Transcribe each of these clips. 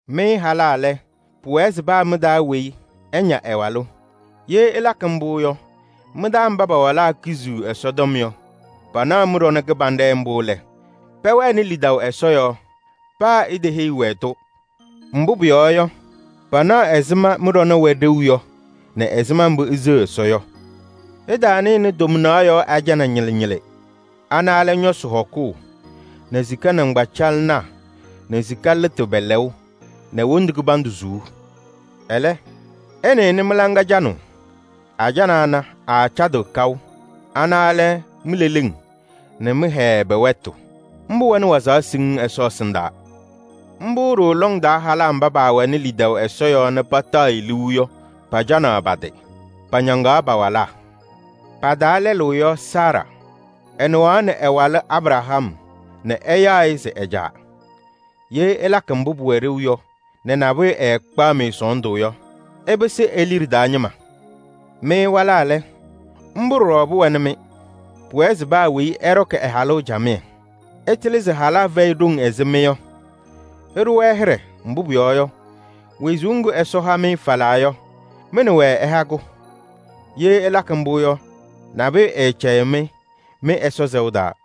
Mɩ halaa lɛ, pʋwɛɛ se paa mɩ-taa weyi ɛña ɛ-walʋ. Ye ɩlakɩ mbʋ yɔ, mɩ-taa mba pa-walaa kiziɣ Ɛsɔtɔm yɔ, panaɣ mɩ-ɖɔnɛ kɩbanɖɛ mbʋ lɛ, pɛwɛnɩ lidaʋ Ɛsɔ yɔɔ, paa iteheyi-wɛ-tʋ. Mbʋ pʋyɔɔ yɔ, panaɣ ɛzɩma mbʋ mɩ-ɖɔnɛ wɛ ɖeu yɔ nɛ ɛzɩma mbʋ iseɣ Ɛsɔ yɔ. Ɩtaanɩnɩ tomnaɣ yɔɔ ajana ñɩlɩ ñɩlɩ. Ana lɛ ñɔsɩ hɔkʋʋ nɛ sika nɩŋgbacaɣlɩnaa nɛ sika lɩtʋ pɛ-lɛʋ nɛ wondu kɩbandʋ suu. Ɛlɛ, ɩnɩnɩ mɩ-hɔ canʋʋ. Ajana ana, aacadɩɣ kaʋ. Ana lɛ mi-leleŋ nɛ mɩ-hɛɛ pɛ-wɛtʋ. Mbʋ wɛnɩ wazaɣ siŋŋ Ɛsɔ ɛsɩndaa. Mbʋ ɖooo lɔŋ taa halaa mba paawɛnɩ lidaʋ Ɛsɔ yɔɔ nɛ pataɣ-ɩ liu yɔ, pacanaɣ pa-tɩ: pañaŋaɣ pa-walaa. Pa-taa lɛlʋ yɔ Saara. Ɛnɩɣaɣnɩ ɛ-walʋ Abraham nɛ ɛyaɣ-ɩ se ɛ-caa. Ye ɩlakɩ mbʋ pʋwɛ ɖeu yɔ nɛ nabʋyʋ ɛɛkpaɣ-mɩ sɔɔndʋ yɔ, ɩpɩsɩ e-liɖe taa ñɩma. Mɩ walaa lɛ, mbʋ ɖɔɖɔ pʋwɛnɩ-mɩ: pʋwɛɛ se paa weyi ɛɖɔkɩ ɛ-halʋ camɩyɛ. Ɩtɩlɩ se halaa fɛyɩ ɖoŋ ɛzɩ mɩ yɔ. Ɩɖʋ-wɛ hɩɖɛ, mbʋ pʋyɔɔ yɔ, wezuu ŋgʋ Ɛsɔ ha-mɩ falaa yɔ, mɩ nɛ wɛ ɛha-kʋ. Ye ɩlakɩ mbʋ yɔ, nabʋyʋ ɛɛcɛyɩɣ-mɩ mɩ-Ɛsɔ sɛʋ taa.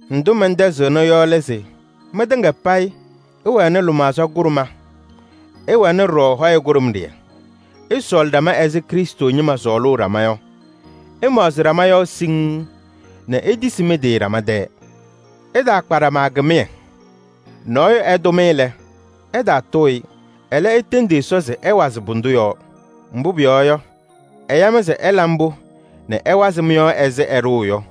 Ndʋ mɛntɛzɩɣnɩ yɔ lɛ se: mɩtɩŋa payɩ ɩwɛnɩ lɩmaɣza kʋɖʋma, ɩwɛnɩ ɖɔɖɔ hɔyɛ kʋɖʋmɖɩyɛ. Ɩsɔɔlɩ ɖama ɛzɩ Krɩstʋ ñɩma sɔɔlʋʋ ɖama yɔ. Ɩmaɣzɩ ɖama yɔɔ siŋŋ nɛ itisi mɩ-tɩ ɖama tɛɛ. Ɩtaakpa ɖama kɩmɩyɛ. Nɔɔyʋ ɛtʋ-mɩ lɛ, ɩtaatʋʋ-ɩ. Ɛlɛ, itendi Ɛsɔ se ɛwazɩ pʋdʋ yɔɔ. Mbʋ pʋyɔɔ yɔ, ɛya-mɩ se ɩla mbʋ nɛ ɛwazɩ mɩ-yɔɔ ɛzɩ ɛɖʋʋ yɔ.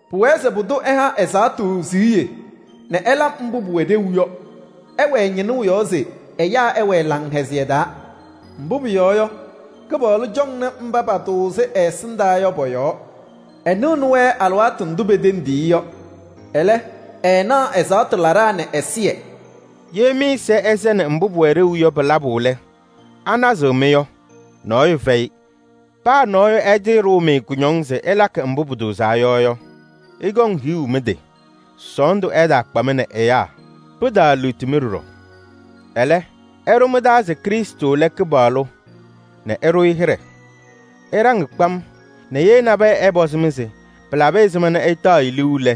Pʋwɛɛ se pʋdʋ ɛha ɛzaɣtʋ siɣye nɛ ɛla mbʋ pʋwɛ ɖeu yɔ. Ɛwɛɛ ñɩnʋʋ yɔɔ se ɛyaa ɛwɛɛ laŋhɛzɩyɛ taa. Mbʋ pʋyɔɔ yɔ, Kɩpaɣlʋ cɔŋnɩ mba patʋʋzɩ ɛ-ɛsɩndaa yɔ pɔ-yɔɔ. Ɛnɩɣnɩ-wɛ alɩwaatʋ ndʋ petendiɣ-i yɔ. Ɛlɛ, ɛɛnaɣ ɛzaɣtʋ laɖaa nɛ ɛzɩyɛ.” Ye mɩ-ɛza ɛsɛnɩ mbʋ pʋwɛ ɖeu yɔ pɩ-labʋ lɛ, anazɩɣ-mɩ yɔ? Nɔɔyʋ fɛyɩ. Paa nɔɔyʋ ɛtɩɩɖʋʋ-mɩ kʋñɔŋ se ɩlakɩ mbʋ pʋtʋʋzaa yɔ yɔ, ɩkɔŋ hiɣu mɩ-tɩ! Sɔɔndʋ ɛtaakpa-mɩ nɛ ɛyaa. Pɩtaaliɣti-mɩ ɖɔɖɔ. Ɛlɛ, ɩɖʋ mɩ-taa se Krɩstʋ lɛ Kɩpaɣlʋ nɛ ɩɖʋ-ɩ hɩɖɛ. Ɩɖaŋ kpam nɛ ye nabɛyɛ ɛpɔzɩ-mɩ se pɩlabɩ ɛzɩma nɛ ɩtaɣ-ɩ liu lɛ,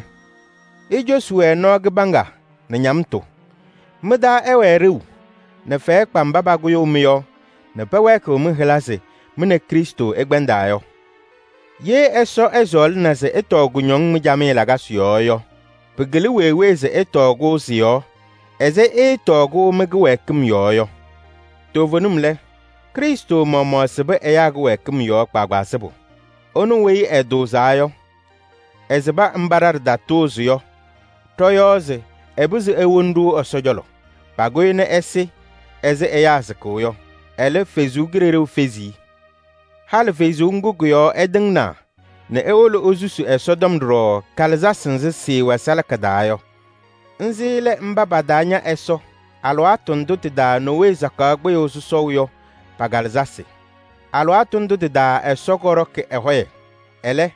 icosi-wɛ nɔɔ kɩbaŋga nɛ ñamtʋ. Mɩ-taa ɛwɛɛ ɖeu nɛ fɛyɛ kpa mba pakʋyʋʋ mɩ-yɔɔ nɛ pɛwɛɛkɩɣ mɩ-hɩla se mɩ nɛ Krɩstʋ ɩkpɛndaa yɔ. Ye Ɛsɔ ɛsɔɔlɩna se ɩtɔɔ kʋñɔŋ mɩ-camɩyɛ lakasɩ yɔɔ yɔ, pɩkɩlɩ wee wee se ɩtɔɔ-kʋ ɛzɩ ɩɩtɔɔ-kʋ mɩ-kɩwɛɛkɩm yɔɔ yɔ. Toovenim lɛ, Krɩstʋ maɣmaɣ sɩbɩ ɛyaa kɩwɛɛkɩm yɔɔ kpaagbaa sɩbʋ. Ɛnʋ weyi ɛtʋʋzaa yɔ, ɛsɩbɩ kɩtatʋʋzɩŋ ɖa ɖɔ-yɔɔ se ɛpɩzɩ ewoni-ɖʋ Ɛsɔ cɔlɔ. Pakʋ-ɩ nɛ ɛsɩ ɛzɩ ɛyaa sɩkʋʋ yɔ. Ɛlɛ, Ɛsɔ Kalɩzaɣ fezi-i. Halɩ Kalɩzaɣ ŋga kɔ-yɔɔ ɛtɩŋnaa nɛ ewolo esusi ɖɔɖɔ kalɩzasɩ Ɛsɔtɔm salaka taa. Nzɩ lɛ mba pataaña Ɛsɔ alɩwaatʋ ndʋ tɩ-taa Nowee sakaɣ kpɩyʋʋ sɔsɔʋ yɔ pa-kalɩzasɩ. Tɩ-taa Ɛsɔ kɔɖɔkɩ ɛ-hɔyɛ. Ɛlɛ,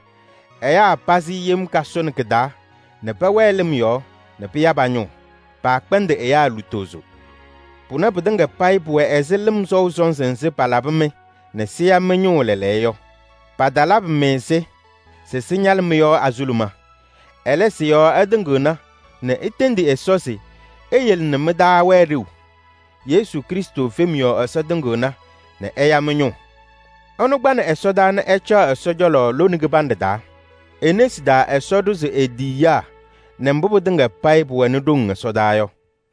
ɛyaa pazɩ yem kasʋnɩ kɩ-taa nɛ pɛwɛɛ lɩm yɔɔ nɛ pɩya pa-ñʋʋ. Paakpɛndɩ ɛyaa lutozo. Pʋnɛ pɩtɩŋa payɩ pʋwɛ ɛzɩ lɩm sɔʋ sɔnzɩ nzɩ palabɩ-mɩ nɛ sɩya mɩ-ñʋʋ lɛɛlɛɛyɔ yɔ. Patalabɩ-mɩ-sɩ se sɩñalɩ mɩ-yɔɔ azuluma. Ɛlɛ, sɩ-yɔɔ ɩtɩŋɩɣna nɛ itendi Ɛsɔ se eyele nɛ mɩ-taa wɛɛ ɖeu. Yesu Krɩstʋ fem yɔɔ Ɛsɔ tɩŋɩɣna nɛ ɛya mɩ-ñʋʋ. Ɛnʋ kpanɩ ɛsɔdaa nɛ ɛcaɣ Ɛsɔ cɔlɔ lone kɩbanɖɛ taa. E-nesi taa Ɛsɔ ɖʋzɩ e-tiyiyaa nɛ mbʋ pɩtɩŋa payɩ pʋwɛnɩ ɖoŋ ɛsɔdaa yɔ.